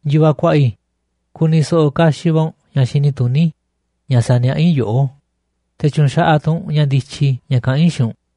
Yu̱vaꞌ kuaꞌa i̱, ku̱ni̱ so̱ꞌo̱ kaxiꞌ va̱ u̱nꞌ ña̱ xini tuní ña̱ saniaꞌá i̱ yoꞌó, te̱ tyu̱nxaꞌaꞌ tu̱ u̱nꞌ ña̱ ndityi ña̱ kaꞌán i̱ xiinꞌ u̱nꞌ.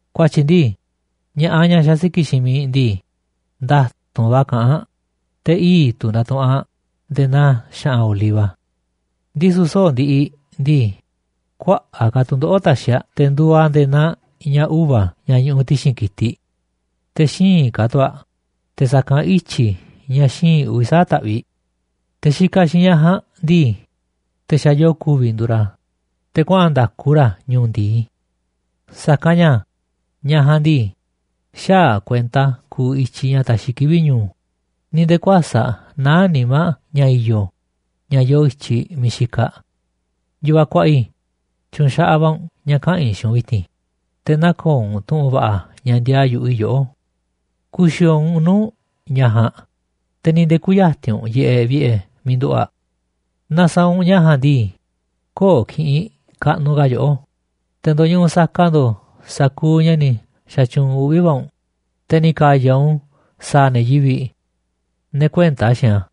Ku̱a̱tyi̱ ndii, ña̱ꞌaꞌ ñaꞌ xasiki̱ꞌ xiinꞌ miiꞌ ndii, nda̱tu̱nꞌ va̱ kaꞌán aꞌ, te̱ ii̱ꞌ tu̱ ndatuꞌunꞌ aꞌ nde̱e̱ naa xa̱ꞌa̱n oliva. Ndisu̱ soꞌo̱ꞌ ndiꞌiꞌ ndii, kuaꞌa̱ꞌ ka̱ tu̱ndoꞌo̱ꞌ taxiꞌ aꞌ, te̱ nduuꞌ aꞌ nde̱e̱ naa ña̱ uva̱ ña̱ ñuꞌuꞌ ti̱xi̱n ki̱tiꞌ. Te̱ xíinꞌ ka̱ tu̱ aꞌ te̱ sa̱kanꞌ ityi̱ ña̱ xíinꞌ uvi̱ sa̱aꞌ taꞌviꞌ. Te̱ xikaꞌ xiinꞌ ñaꞌ ja̱a̱nꞌ ndii, te̱ xa̱ yoo ku̱vi̱ nduuꞌ ra̱, te̱ kuaꞌa̱n nda̱ku ra̱ ñu̱u̱ ndi̱i. Sa̱kanꞌ ña̱, ñaꞌ ja̱a̱nꞌ ndii, xäaꞌ aꞌ kuenta kuuꞌ i̱tyiꞌ ña̱ taxiꞌ kivi̱ꞌ ñu̱u̱, ni̱ nde̱e̱ kuäsa̱ꞌ naá nimá aꞌ ña̱ i̱yo̱ ña̱ yoo i̱tyiꞌ miiꞌ xikaꞌ aꞌ. Yu̱vaꞌ kuaꞌa i̱, tyu̱u̱n xaꞌaꞌ va̱ u̱nꞌ ña̱ kaꞌa̱n i̱ xiinꞌ u̱nꞌ vi̱ti̱n, te̱ nä̱ko̱o̱ u̱nꞌ tu̱ꞌu̱n va̱ꞌa̱ ña̱ ndiaa yu̱ꞌuꞌ i̱ yoꞌó. Ku̱xi̱o̱o̱ u̱nꞌ nuu̱ꞌ ñaꞌ ja̱a̱nꞌ, te̱ ni̱ nde̱e̱ kü̱ya̱ti̱n u̱nꞌ yiꞌeꞌ vi̱ꞌe̱ miiꞌ nduꞌu̱ꞌ aꞌ. Naaꞌ sa̱a̱ u̱nꞌ ña̱ ja̱a̱nꞌ ndii, köo̱ꞌ ki̱ꞌi̱n kaꞌnuꞌ ka̱ yoꞌó, te̱ ndo̱ñuꞌuꞌ saka ndo̱o̱ sa̱kuuꞌ ña̱ ni̱ xa̱tyuunꞌ uꞌvi̱ va̱ u̱nꞌ, te̱ ni̱ ka̱ya̱ u̱nꞌ u̱n sa̱a̱ ne̱ yivi̱ꞌ, ne̱ kuënta xiinꞌ a̱.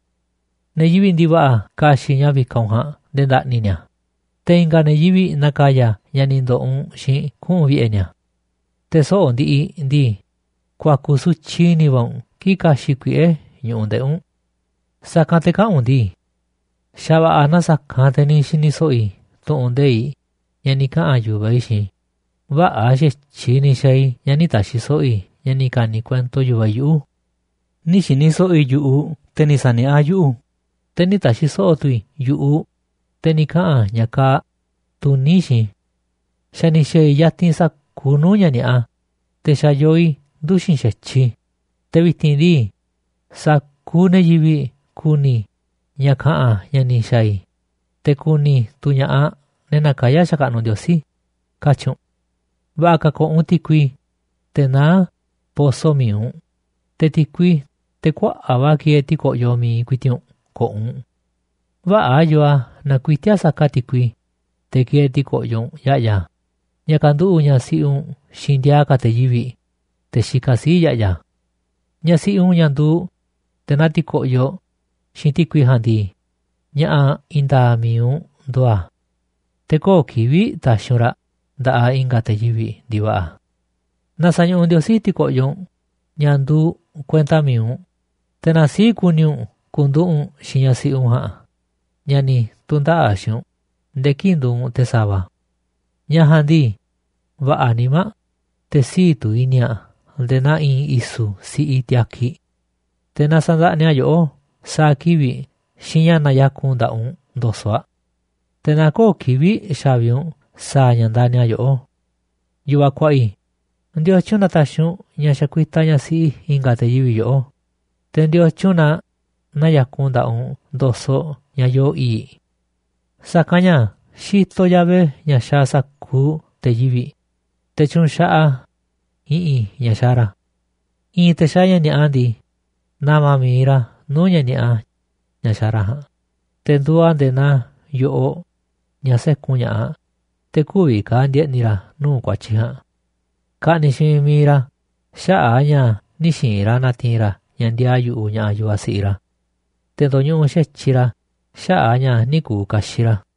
Ne̱ yivi̱ꞌ ndi̱va̱ꞌa̱ ka̱xi̱ꞌ ña̱ vikaꞌ u̱nꞌ ja̱a̱nꞌ nde̱e̱ nda̱ꞌni̱ ni̱a̱, te̱ i̱nga̱ ne̱ yivi̱ꞌ na̱ka̱ya̱ ña̱ ni̱ ndo̱ꞌo̱ u̱nꞌ xiinꞌ kuꞌu̱n vi̱ꞌe̱ ni̱a̱. Te̱ soꞌo̱ꞌ ndiꞌiꞌ ndii, ku̱a̱ku̱ sutyiꞌ i̱ni̱ va̱ u̱nꞌ kii̱ꞌ ka̱xi̱ꞌ kuiꞌe̱ ñu̱ꞌuꞌ ndeꞌi̱ u̱nꞌ. Sa̱kanꞌ te̱ kaꞌa̱n u̱nꞌ ndii: “Xa̱ va̱ꞌa̱ na sa̱kanꞌ te̱ ni̱ xini so̱ꞌo̱ i̱ tu̱ꞌu̱n nde̱iꞌ ña̱ ni̱ kaꞌa̱n yu̱vaꞌ i̱ xiinꞌ i̱. Vä̱ꞌa̱ xa̱tyiꞌ ni̱ xa̱a̱ i̱ ña̱ nï̱ ta̱xi̱ so̱ꞌo̱ i̱ ña̱ ni̱ ka̱ni̱ kuento yu̱vaꞌ i̱ yuꞌu̱. Nï̱ xi̱ni̱ so̱ꞌo̱ i̱ yu̱ꞌuꞌ te̱ ni̱ sa̱niaꞌá yuꞌu̱, te̱ nï̱ ta̱xi̱ so̱ꞌo̱ tu̱ i̱ yu̱ꞌuꞌ te̱ ni̱ kaꞌa̱n ña̱ kaaꞌ tuní xiinꞌ i̱. Xa̱ ni̱ xa̱a̱ i̱ yatinꞌ sa̱kuuꞌ nuu̱ꞌ ña̱ ni̱a̱ꞌa, te̱ xa̱ yoo i̱ nduxi̱n xa̱tyiꞌ i̱, te̱ vi̱ti̱n ndii, sa̱kuuꞌ ne̱ yivi̱ꞌ ku̱ni̱ ña̱ ka̱ꞌa̱n ña̱ ni̱ xaa̱ i̱, te̱ ku̱ni̱ tu̱ ña̱ꞌaꞌ ne̱ nakayá xakaꞌnuꞌ Ndiosí”, katyi̱ u̱nꞌ. Va̱ꞌa̱ ka̱ ko̱ꞌo̱ u̱nꞌ ti̱kui, teꞌ naá poso mi̱iꞌ u̱nꞌ, te̱ ti̱kui, teꞌ kuaꞌa̱ꞌ va̱ kieeꞌ ti̱ko̱yoꞌ mi̱iꞌ ku̱i̱ti̱ꞌ u̱nꞌ ko̱ꞌo̱ u̱nꞌ. Vä̱ꞌa̱ yoo a̱ naaꞌ kuiti̱a̱ saka ti̱kui, teꞌ kieeꞌ ti̱ko̱ꞌyoꞌ u̱nꞌ ya̱ꞌya̱, ña̱ ka̱nduꞌu̱ꞌ ñaꞌ siꞌi u̱nꞌ xiinꞌ ndiaa ka̱ te̱ yivi̱ꞌ, te̱ xikaꞌ sii̱ꞌ ya̱ꞌya̱. Ñaꞌ siꞌi u̱nꞌ, ñaꞌ nduuꞌ nde̱e̱ naa ti̱ko̱ꞌyoꞌ xiinꞌ ti̱kui ja̱a̱nꞌ ndii, ña̱ꞌa̱ i̱i̱n nda̱a̱ꞌ mi̱iꞌ u̱nꞌ nduuꞌ a̱. Te̱ köo̱ꞌ kivi̱ꞌ ta̱xi̱ u̱nꞌ raꞌ nda̱ꞌaꞌ i̱nga̱ te̱ yivi̱ꞌ ndi̱va̱ꞌa̱. Na sa̱ñuꞌuꞌ Ndiosí ti̱ko̱ꞌyoꞌ u̱nꞌ ña̱ nduuꞌ kuenta mi̱iꞌ u̱nꞌ, te̱ na sii̱ꞌ ku̱ni̱ u̱nꞌ ku̱nduꞌu̱ꞌ u̱nꞌ xiinꞌ ñaꞌ siꞌi u̱nꞌ ja̱a̱nꞌ ñaꞌ ni̱ tu̱ndaꞌa̱ꞌ xiinꞌ u̱nꞌ nde̱e̱ kii̱ꞌ nduuꞌ u̱nꞌ te̱ sa̱va̱. Ñaꞌ ja̱a̱nꞌ ndii, va̱ꞌa̱ nimá aꞌ, te̱ sii̱ꞌ tu̱ i̱ni̱ aꞌ nde̱e̱ naa i̱i̱n i̱su̱ siꞌi tiakiꞌ. Te̱ na sa̱ndaꞌniꞌ aꞌ yoꞌó sa̱a̱ kivi̱ꞌ xiinꞌ ña̱ naya̱kun nda̱ꞌaꞌ u̱nꞌ ndo̱soꞌ aꞌ. Te̱ na köo̱ꞌ kivi̱ꞌ xa̱vi u̱nꞌ sa̱a̱ ña̱ ndani̱ aꞌ yoꞌó. Yu̱vaꞌ kuaꞌa i̱, ¿ndiotyun na taxiꞌ u̱nꞌ ña̱ xakuitaꞌ ñaꞌ siꞌi i̱nga̱ te̱ yivi̱ꞌ yoꞌó, te̱ ndiotyun na naya̱kun ndaꞌaꞌ u̱nꞌ ndo̱soꞌ ñaꞌ yoo i̱i̱ꞌ? Sa̱kanꞌ ña̱ xitoꞌ Yahvé ña̱ xaaꞌ sa̱kuuꞌ te̱ yivi̱ꞌ, te̱ tyuunꞌ xaꞌaꞌ a̱ i̱ꞌi̱n ña̱ xaaꞌ ra̱. I̱i̱n te̱ xaaꞌ ña̱ ni̱a̱ꞌa ndii, na̱ma̱ mi̱iꞌ ra̱ nuu̱ꞌ ña̱ ni̱a̱ꞌa ña̱ xaaꞌ ra̱ ja̱a̱nꞌ, te̱ nduuꞌ a̱ nde̱e̱ naa yo̱ꞌoꞌ ña̱ sékun ña̱ꞌaꞌ, te̱ kü̱vi̱ ka̱ ndi̱e̱ꞌni̱ ra̱ nuu̱ꞌ ku̱a̱tyi̱ ja̱a̱nꞌ. Ka̱ꞌni̱ꞌ xiinꞌ miiꞌ mi̱iꞌ ra̱ xaꞌa̱ꞌ a̱ ña̱ nï̱ xi̱i̱n ra̱ na̱ti̱i̱n ra̱ ña̱ ndiaa yu̱ꞌuꞌ ña̱ꞌaꞌ yu̱vaꞌ siꞌiꞌ ra̱. Te̱ ndo̱ñuꞌuꞌ xa̱tyiꞌ ra̱ xaꞌa̱ꞌ a̱ ña̱ nï̱ ku̱u̱ kaxiꞌ ra̱.